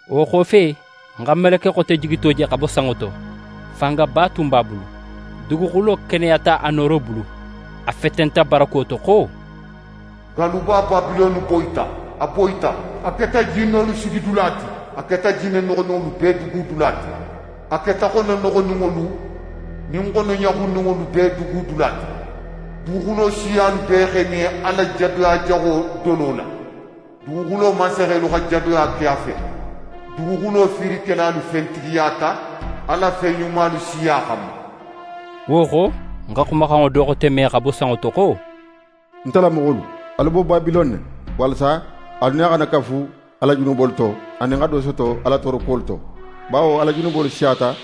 Wo xofe, ń xa meleke xote jigito je xa bo sanŋo to. Fangaba tun b'a bulu. Duguxulo keneyata a nooro bulu. A fetenta barako to xo: «Galluba Babilone boyita, a boyita! A keta jinnolu sigidula ti, a keta jinne noxoninŋolu bee dugudula ti, a keta xono noxoninŋolu nin xono ɲaxunninŋolu bee dugudula ti. Duguxulo siyalu bee x'e min a la jadoya jaxo dolo la. Duguxulo mansaxelu xa jadoya ke a fe. Duguxulo fiirikelalu fentigiyata a la fen ɲumalu siya xanma.» Wo xo, ń xa xumaxanŋo do xote me xa bo sanŋo to xo: «Nte la moxolu, alu bo Babilone, walasa alu nin a xana kafu a la junubolu to, anin xa do soto a la toorokuwolu to. Bawo a la junubolu siyata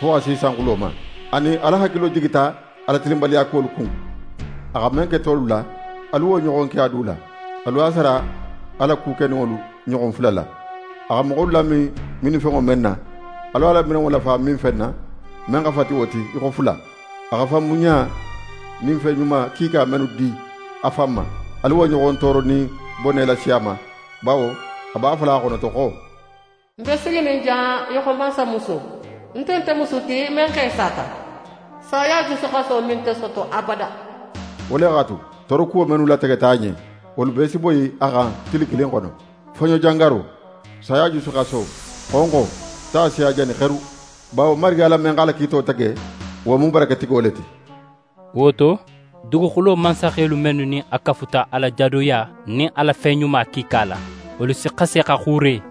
fo xa si sanxulo ma, anin Ala hakilo jigita a la tilinbaliyakuwolu kun. A xa men ke tolu la, alu wo ɲoxon ke a du la. Alu a sara a la ku keninŋolu ɲoxon fula la. A xa moxolu lamin minfenŋo men na, alu a la minnilanŋo lafa minfen na, men xa fati wo ti í xo fula. A xa fanbunɲa nin fen ɲuma kiika mennu di a fan ma, alu wo ɲoxon tooro nin bone lasi a ma. Bawo a b'a fola a xonoto xo: “Ń be siginin jan í xo mansamuso, ń nte musu ti men xe sata, saya jusuxaso me nte soto abada.” Wo le x'a tu, toorokuwo mennu lategeta a ɲen, wolu bee si boyi a xan tili kilin xono: Foɲojangaro, saya jusuxaso, xonxo, ta si a jani xeru. Bawo Marigi Ala men x'a la kiito tege, wo mu baraketigo le ti.» Wo to, duguxulo mansaxelu mennu nin a kafuta a la jadoya nin a la fen ɲuma kiika la, wolu si xasi xa xuure,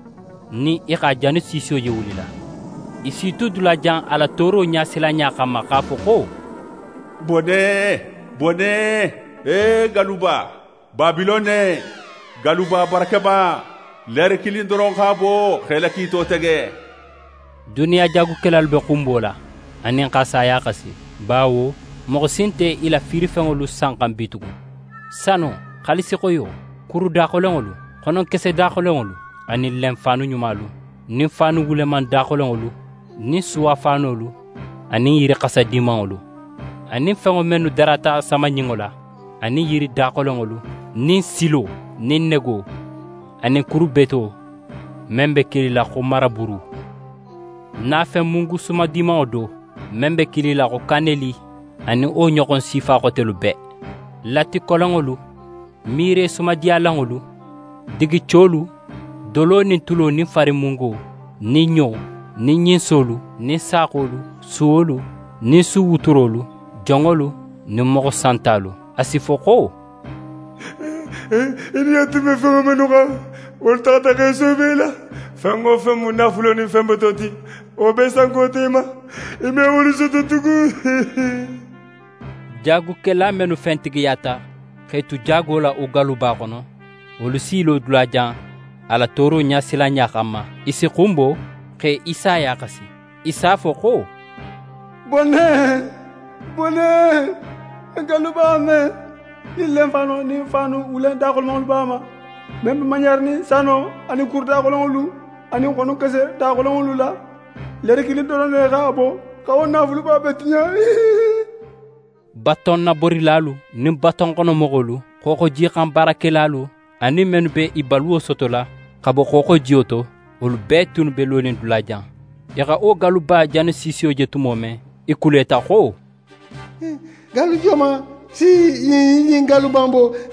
nin i x'a janisiisiyo je wulila. I s'i tu dulajan a la tooro ɲasilanɲa xanma x'a fo xo: «Bone! Bone! E galluba, Babilone, galluba barakema! Leere kilin doron x'a bo xa í la kiito tege!» Duniya jaagukelalu be xunbola, anin x'a saya xasi, bawo moxo si nte i la fiirifenŋolu sanxan bitugun: Sano, xaalisixoyo, kuru daxolenŋolu, xononkese daxolenŋolu nin lenfaanu ɲumalu nin faanu wuleman daxolenŋolu, nin suwafaanolu, a nin yiri xasa dimanŋolu, anin fenŋo mennu darata samaɲinŋo la, anin yiri daxolenŋolu, nin silo nin nego anin kuru beto men be kilila xo maraburu. Nafen mungu sumadimanŋo do, men be kilila xo kaneli, anin wo ɲoxon sifa xotelu bee, latikolonŋolu, mire sumadiyalanŋolu, digicolu, dolo nin tulo nin farinmungo, nin ɲo, nin ɲinsolu, nin saaxolu, suwolu, nin suwuturolu, jonŋolu, nin moxo santalu. A si fo xo: «Í niyo tun be fenŋo mennu xan, wolu taxata x'e soobo í la. Fen wo fen mu naafulo nin fen beto ti, wo bee sankota í ma. Í me wolu soto tugun.» Jaagukela mennu fentigiyata x'e tu jaago la wo galluba xono, wolu s'i lo dulajan a la tooro ɲasilanɲa xanma. I si xunbo, x'é saya xasi; i s'a fo xo: «Bone! Bone! Galluba men, nin lenfaano nin faanu wuleman daxolenŋolu b'a ma, men be maɲaranin sano nin kuru daxolenŋolu anin xononkese daxolenŋolu la, leere kilin doron ne x'a bo xa wo naafuluba bee tiɲa!» Batonnaborilalu nin batonxonomoxolu, xooxojixan baarakelalu anin mennu be i baluwo sotola xa bo xooxojiyo to, wolu bee tunnu be lonin dulajan. I xa wo galluba janisiisiyo je tumo men, i kuleta xo: «Gallu joman si ɲin galluba in bo?»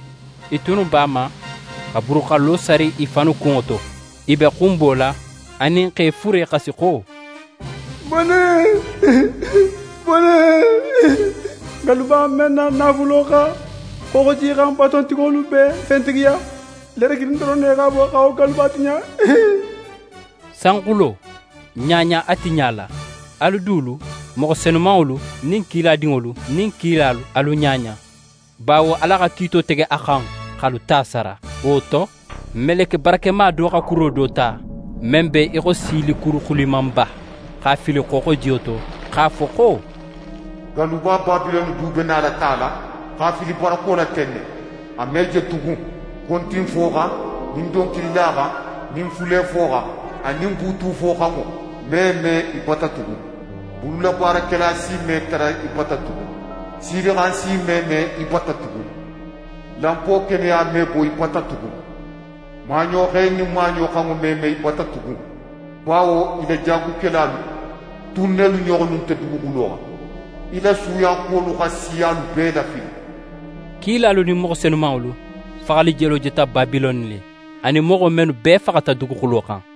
I tunnu b'a ma xa buruxallo sari i fannu kunŋo to, i be xunbola, anin x'é fure xasi xo: «Bone! Bone! Galluba men na naafulo xa xooxojixan batontigolu bee fentigiya, leere kilin doron ne x'a bo xa wo galluba tiɲa.» Sanxulo, ɲaɲa a tiɲa la! Alu dulu, moxo senumanŋolu nin kiladinŋolu nin kilalu, alu ɲaɲa, bawo Ala xa kiito tege a xan, x'alu ta sara. Wo to, meleke barakema do xa kuro do ta, men be í xo silikuru xulimanba, x'a fili xooxojiyo to, x'a fo xo: «Galluba Babilone du be nala tala x'a fili barako la ten ne. A me je tugun. Kontinfoxan nin donkililaxan nin fulefoxan anin buutufoxanŋo me me í bata tugun. Bululabaarakela si me tara í bata tugun. Silixan si me me í bata tugun. Lanpo keneya me bo í bata tugun. Maaɲoxe nin maaɲo xanŋo me me í bata tugun, bawo í la jaagukelalu tun nelu ɲoxonnu nte duguxulo xan. Í la suuyakuwolu xa siyalu bee lafili.» Kilalu nin moxo senumanŋolu faxali jelo jeta Babilone le, anin moxo mennu bee faxata duguxulo xan.